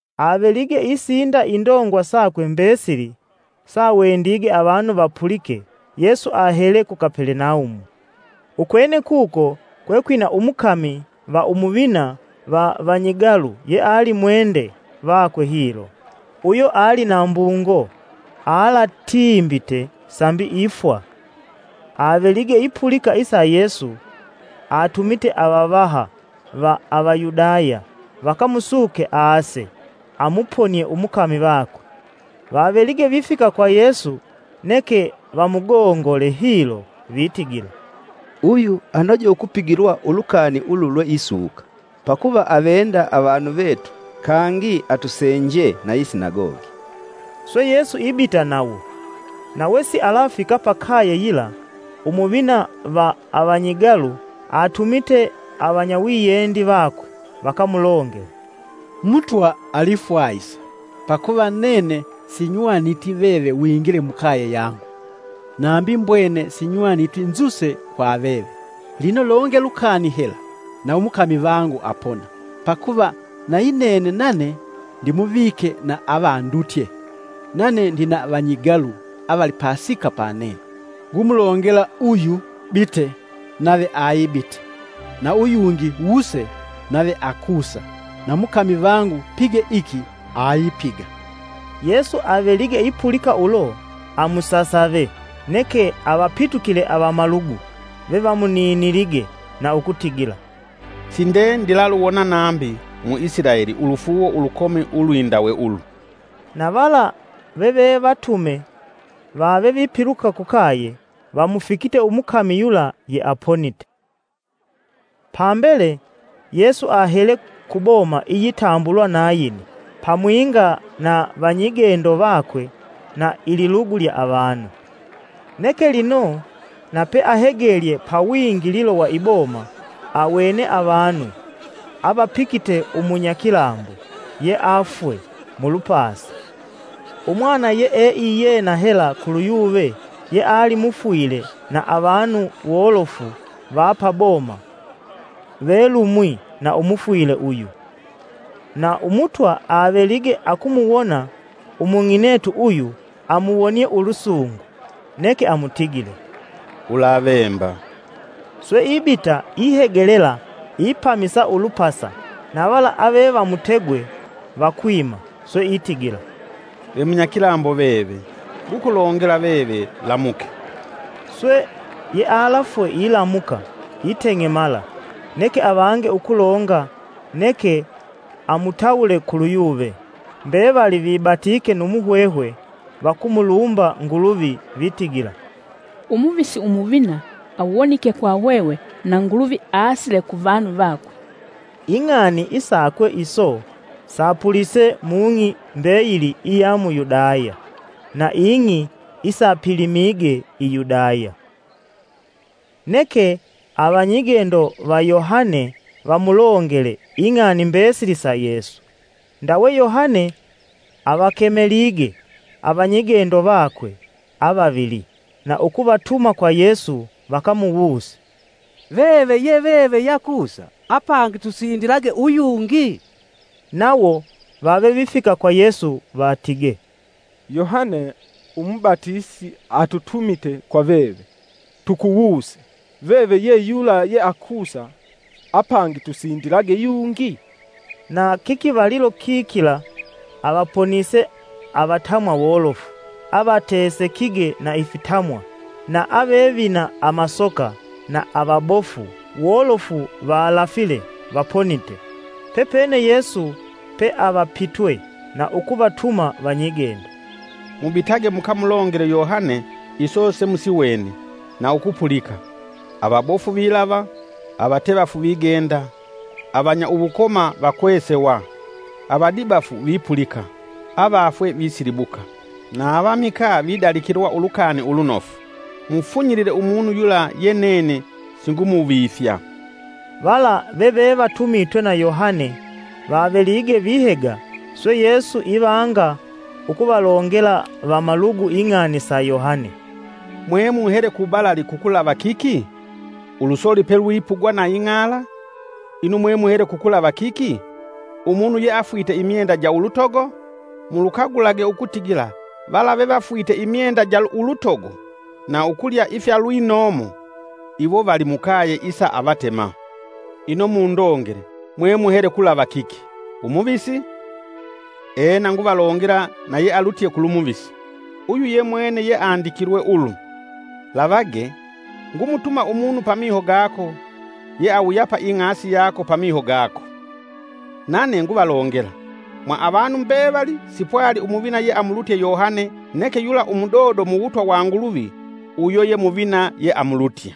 Avelige isinda indongwa sakwe mbesili sawendige avanu vapulike Yesu ahele ku Kapelenaumu. Ukwene kuko kwe kwina umukami va umuvina va vanyigalu yeali mwende vakwe hilo, uyo ali na mbungo alaatimbite sambi ifwa. Avelige ipulika isa Yesu, atumite avavaha va Avayudaya, vakamusuke aase amuponie umukami vakwe. Vavelige vifika kwa Yesu neke vamugongole hilo vitigila, “Uyu anoje ukupigilwa ulukani ulu lweisuka, Pakuva avenda, avanu vetu kangi atusenjee na yi sinagogi.” Swe Yesu ibita nawo, na wesialafika pa kaye yila, Umuvina va avanyigalu atumite avanyawiyendi vakwe, vakamulongele: “Mutwa alifwahisa, pakuva nene sinywaniti veve wingile mukaye yangu. Nambi mbwene sinywaniti nzuse kwa veve. Lino longe lukani hela na umukami vangu apona. Pakuva nayi nene nane ndimuvike na avandutye, nane ndina vanyigalu avali pasika panene. Ngumulongela uyu, ‘Bite!’, nave ayibita, na uyungi, ‘Wuse!’ nave akusa na mukami vangu, ‘pige iki!’ ayipiga.” Yesu avelige ipulika ulo amusasave, neke avapitukile avamalugu vevamuninilige na ukutigila, “Sinde ndilaluwona nambi mu Isilaeli ulufuuwo ulukomi ulwindawe ulu.” Na vala veve vatume vave vipiluka kukaye, vamufikite umukami yula yeaponite. Pambele Yesu ahele ku boma iyitambulwa Nayini pamwinga na vanyigendo vakwe na ililugu lya avanu. Neke lino na peahegelye pa wingililo wa iboma awene avanu avapikite umunyakilambo yeafwe mulupasa, umwana yee iyena hela kulu yuve yeali mufwile na avanu wolofu va paboma velumwi na umufwile uyu. Na Umutwa avelige akumuwona umung'inetu uyu amuwonie ulusungu neke amutigile, “Ulavemba.” Swe ibita ihegelela ipamisa ulupasa, na vala ave vamutegwe vakwima. Swe itigila, “Ve Munyakilambo veve! Ngukulongela, veve lamuke!” Swe yealafwe ilamuka iteng'emala, neke avange ukulonga neke amutawule kulu yuve. Mbevali vibatike nu muhwehwe; vakumulumba Nguluvi vitigila, “Umuvisi Umuvina awonike kwa hwehwe na Nguluvi aasile ku vanu vakwe.” Ing'ani isakwe iso sapulise mung'i mbeyili iya mu Yudaya na ing'i isapilimige i Yudaya. Neke avanyigendo va Yohane vamulongele ing'ani mbesili sa Yesu. Ndawe Yohane, avakemelige avanyigendo vakwe avavili, na ukuvatuma kwa Yesu vakamuwuse, “Veve ye veve yeakusa apangi tusindilage uyungi?” Nawo vave vifika kwa Yesu vatige, “Yohane umubatisi atutumite kwa veve, tukuwuse: ‘Veve ye yula yeakusa, apangi tusindilage yungi?’” Na kikivalilo kikila avaponise avatamwa wolofu avatesekige na ifitamwa na ave vina amasoka na avabofu wolofu valafile vaponite. Pepene Yesu peavapitwe na ukuvatuma vanyigendo, “Mubitage mukamulongele Yohane iso semusiwene na ukupulika: avabofu vilava, avatevafu vigenda, avanya uwukoma vakwesewa, avadibafu vipulika, avafwe visilibuka, na avamikaa vidalikilwa ulukani lunofu. Mufunyilile umunu yula ye nene singumuvifya.” Vala veve vatumitwe na Yohane vavelige vihega, swe Yesu ivanga ukuvalongela vamalugu ing'ani sa Yohane: “Mwemuhele ku balali kukulava kiki? Ulusoli pelwipugwa na ing'ala? Ino mwemuhele kukulava kiki? Umunu yeafwite imyenda ja ulutogo? Mulukagulage ukutigila vala vevafwite imyenda ja ulutogo na ukulya ifya ulwinomo iwo vali mukaye isa avatema! Ino mundongele mwemuhele kulava kiki? Umuvisi? Ena nguvalongela na yealutye kulu muvisi. Uyu yemwene yeandikilwe ulu: ‘Lavage, ngumutuma umunu pamiho gako, yeawuyapa ing'asi yako pamiho gako.’” Nane nguvalongela, “Mwa avanu mbevali sipwali umuvina yeamulutye Yohane neke yula umudodo mu wutwa wa Nguluvi uyo ye muvina yeamulutye.”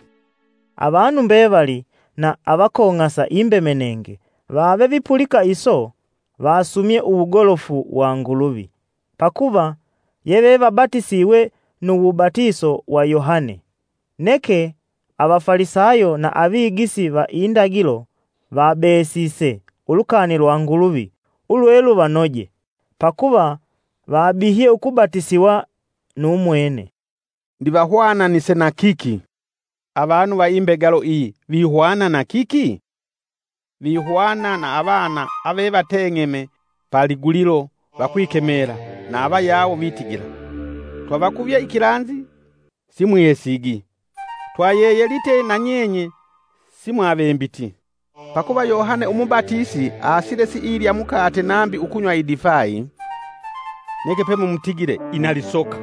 Avanu mbevali na avakong'asa imbemenenge vave vipulika iso vasumye uwugolofu wa Nguluvi, pakuva yevevabatisiwe nu wubatiso wa Yohane. Neke avafalisayo na avigisi va indagilo vabesise ulukani lwa Nguluvi ulwe luvanoje, pakuva vabihye ukubatisiwa nu mwene. Ndivahwananise na kiki, “Avanu va imbegalo iyi, vihwana na kiki? Vihwana na avana avevateng'eme pa ligulilo vakwikemela na avayawo vitigila: ‘Twavakuvye ikilanzi simwihesigi! Twayeyelite na nyenye simwavembiti!’ Pakuva Yohane umubatisi aasile siilya mukate nambi ukunywa idifai, neke pemumutigile: ‘Ina lisoka!’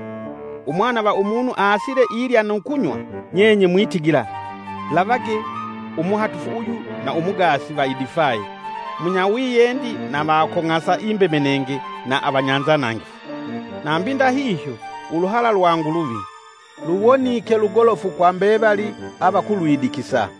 Umwana va Umunu aasile ilya nu kunywa nyenye mwitigila: ‘Lavage, umuhatufu uyu na umugaasi va idifai, munyawiyendi na avakong'asa imbemenenge na vanyanzanangifu!’ Nambi ndahihyo uluhala lwa Nguluvi, luwonike lugolofu kwa mbevali avakulwidikisa.”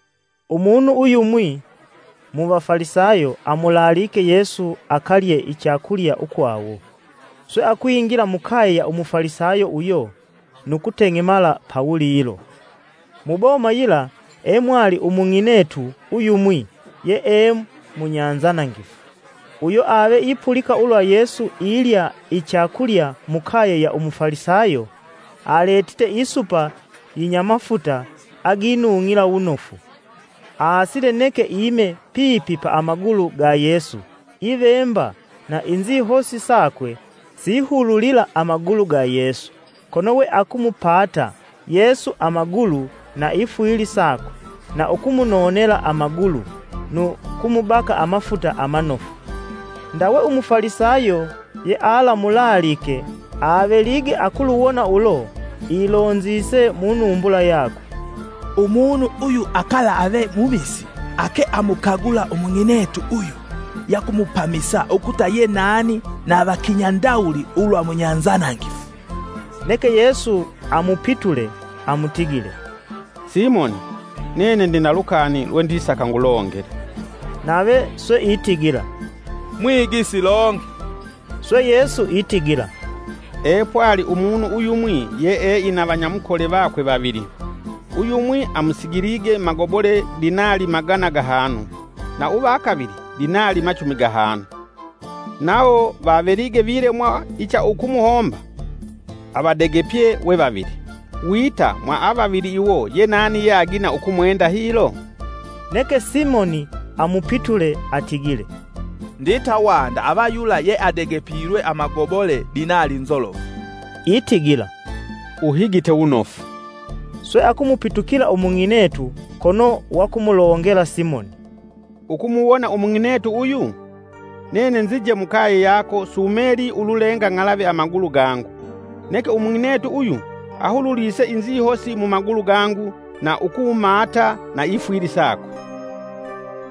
Umunu uyumwi mu vafalisayo amulaalike Yesu akalye ichakulya ukwawo, swe akwingila mukaye ya Umufalisayo uyo nu kuteng'emala pawulilo. Mu boma yila emwali umung'inetu uyumwi yee munyanzanangifu, uyo ave ipulika ulwa Yesu ilya ichakulya mukaye ya Umufalisayo, aletite isupa inyamafuta aginung'ila wunofu. Aasile neke ime pipi pa amagulu ga Yesu ivemba na inzihosi sakwe sihululila amagulu ga Yesu kono we akumupaata Yesu amagulu na ifwili sakwe, na ukumunonela amagulu nu kumubaka amafuta amanofu. Ndawe Umufalisayo yealamulaalike avelige akuluwona ulo ilonzise munumbula yakwe, “Umunu uyu akalaave muvisi, ake amukagula umung'inetu uyu yakumupamisa ukuta ye nani na va kinya ndawuli ulwa munyanzanangifu.” Neke Yesu amupitule amutigile, “Simoni, nene ndina lukani lwendisaka ngulongele.” Nave swe itigila; “Mwigisi longe.” “Swe Yesu itigila epwali umunu uyumwi yee ina vanyamukole vakwe vavili: uyumwi amusigilige magobole dinali magana gahanu na uva kavili dinali machumi gahanu. Nawo vavelige vilemwa icha ukumuhomba, avadegepye we vavili. Wita mwa avavili iwo yenani yeagina ukumwenda hilo?” Neke Simoni amupitule atigile, “Ndita wanda ava yula yeadegepilwe amagobole dinali nzolofu.” Itigila, “Uhigite wunofu.” Swe akumupitukila umung'inetu kono wakumulongela Simoni, “Ukumuwona umung'inetu uyu? Nene nzinje mukaye yako, sumelii ululenga ng'alave amagulu gangu, neke umung'inetu uyu ahululise inzihosi mumagulu gangu na ukumaata na ifwili sakwe.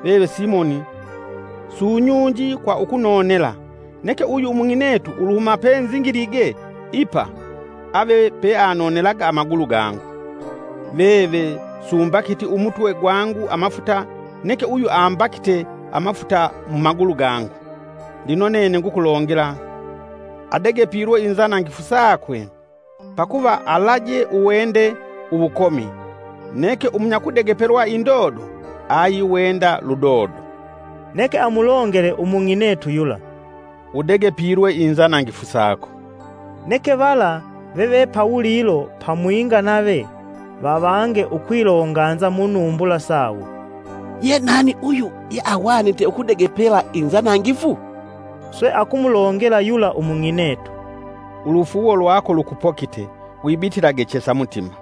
Veve Simoni sunyunji kwa ukunonela, neke uyu umung'inetu uluhuma penzingilige ipa ave peanonelaga amagulu gangu. Veve sumbakiti umutwe gwangu amafuta, neke uyu ambakite amafuta mumagulu gangu. Lino nene ngukulongela, adegepilwe inzanangifu sakwe, pakuva alaje uwende uwukomi, neke munyakudegepelwa indodo ayiwenda ludodo.” Neke amulongele umung'inetu yula, “Udegepilwe inzanangifu sako.” Neke vala veve pawulilo pamwinga nave vavange ukwilonganza munumbula sawo, “Ye nani uyu, yeahwanite ukudegepela inzanangifu?” Swe akumulongela yula umung'inetu, “Ulufuuwo lwako lukupokite, wibitilage chesa mutima.”